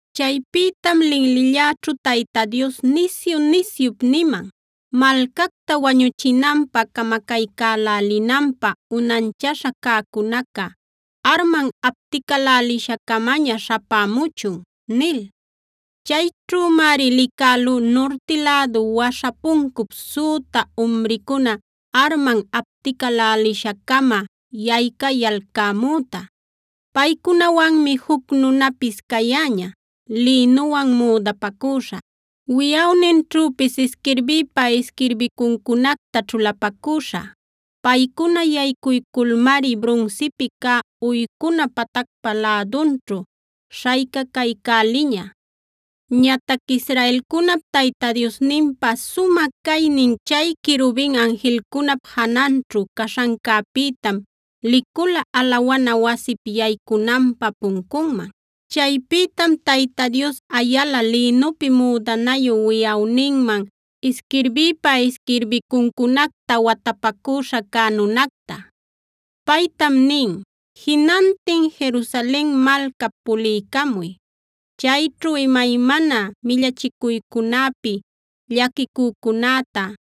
Chaypïtam linlilläćhu Tayta Dios nisyu-nisyup niman: “Malcacta wañuchinanpä, camacaycälälinanpä unanchaśha cäcunaca arman apticälälisha-camaña śhapämuchun” nil. Chayćhümari licälú nurti lädu waśha puncup süta umricuna arman apticälälisha-cama yaycayalcämüta. Paycunawanmi juc nunapis cayäña lïnuwan müdapacüśha, wiꞌawninćhüpis isquirbïpa isquirbicuncunacta ćhulapacüśha. Paycuna yaycuyculmari brunsipi cä uycuna patacpa lädunćhu śhaycacaycäliña. Ñatac Israelcunap Tayta Diosninpa sumä caynin chay querubin anjilcunap jananćhu caśhancäpïtam licula alawana wasip yaycunanpä puncunman. Chaypïtam Tayta Dios ayala lïnupi müdanayu, wiꞌawninman isquirbïpa isquirbicuncunacta watapacüśha cä nunacta. Paytam nin: “Jinantin Jerusalen malcap puliycamuy. Chayćhu imaymana millachicuycunäpi llaquicücunäta,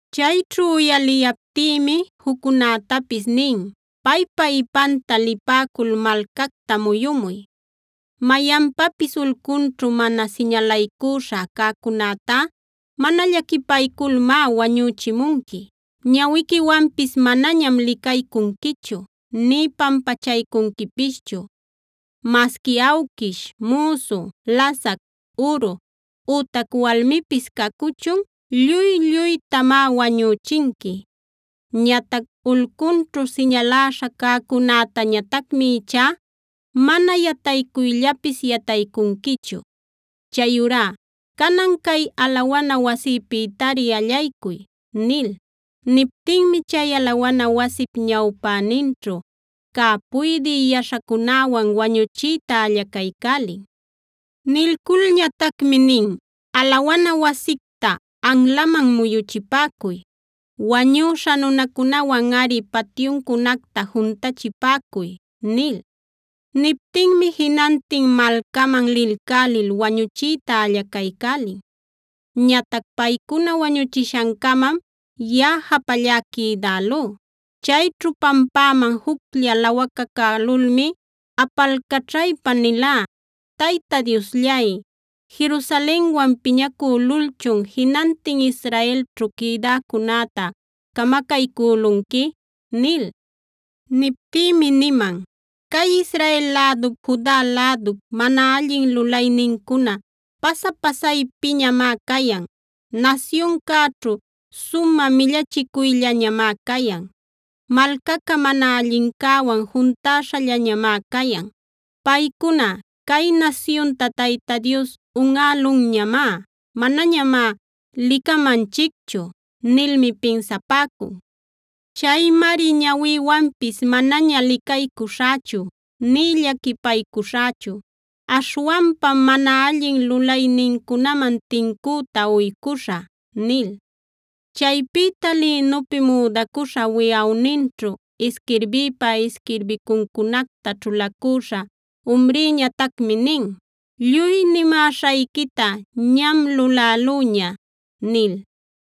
Chayćhu uyaliyaptïmi juccunätapis nin: “Paypa ipanta lipäcul malcacta muyumuy. Mayanpapis ulcunćhu mana siñalaycuśha cäcunätá mana llaquipayculmá wañüchimunqui. Ñawiquiwanpis manañam licaycunquichu nï pampachaycunquipischu. Masqui awquish, müsu, lasac, uru, ütac walmipis cacuchun lluy-lluytamá wañüchinqui. Ñatac ulcunćhu siñaläśha cäcunätañatacmi ichá mana yataycuyllapis yataycunquichu. Chayurá canan cay alawana wasïpïtari allaycuy” nil. Niptinmi chay alawana wasip ñawpäninćhu cä puydï yaśhacunäwan wañuchiyta allacaycälin. Nilculñatacmi nin: “Alawana wasicta anlaman muyuchipäcuy; wañüśha nunacunawanꞌari patyuncunacta juntachipäcuy” nil. Niptinmi jinantin malcaman lilcälil wañuchiyta allacaycälin. Ñatac paycuna wañuchishan-camam yaꞌa japallá quïdälú. Chayćhu pampäman juclla lawacacälulmi apalcaćhaypa nilá: “Tayta Diosllay, ¿Jerusalenwan piñacülulchun jinantin Israelćhu quïdäcunäta camacaycülunqui?” nil. Niptïmi niman: “Cay Israel lädup, Juda lädup mana allin lulaynincuna pasa-pasaypiñamá cayan. Nasyuncäćhu sumä millachicuyllañamá cayan; malcaca mana allincäwan juntäśhallañamá cayan. Paycuna: ‘Cay nasyunta Tayta Dios unꞌälunñamá; manañamá licamanchicchu’ nilmi pinsapäcun. Chaymari ñawïwanpis manaña licaycuśhächu nï llaquipaycuśhächu. Aśhwanpam mana allin lulaynincunaman tincüta uycüśhä” nil. Chaypïta lïnupi müdacuśha, wiꞌawninćhu isquirbïpa isquirbicuncunacta ćhulacüśha umrïñatacmi nin: “Lluy nimäśhayquita ñam lulälüña” nil.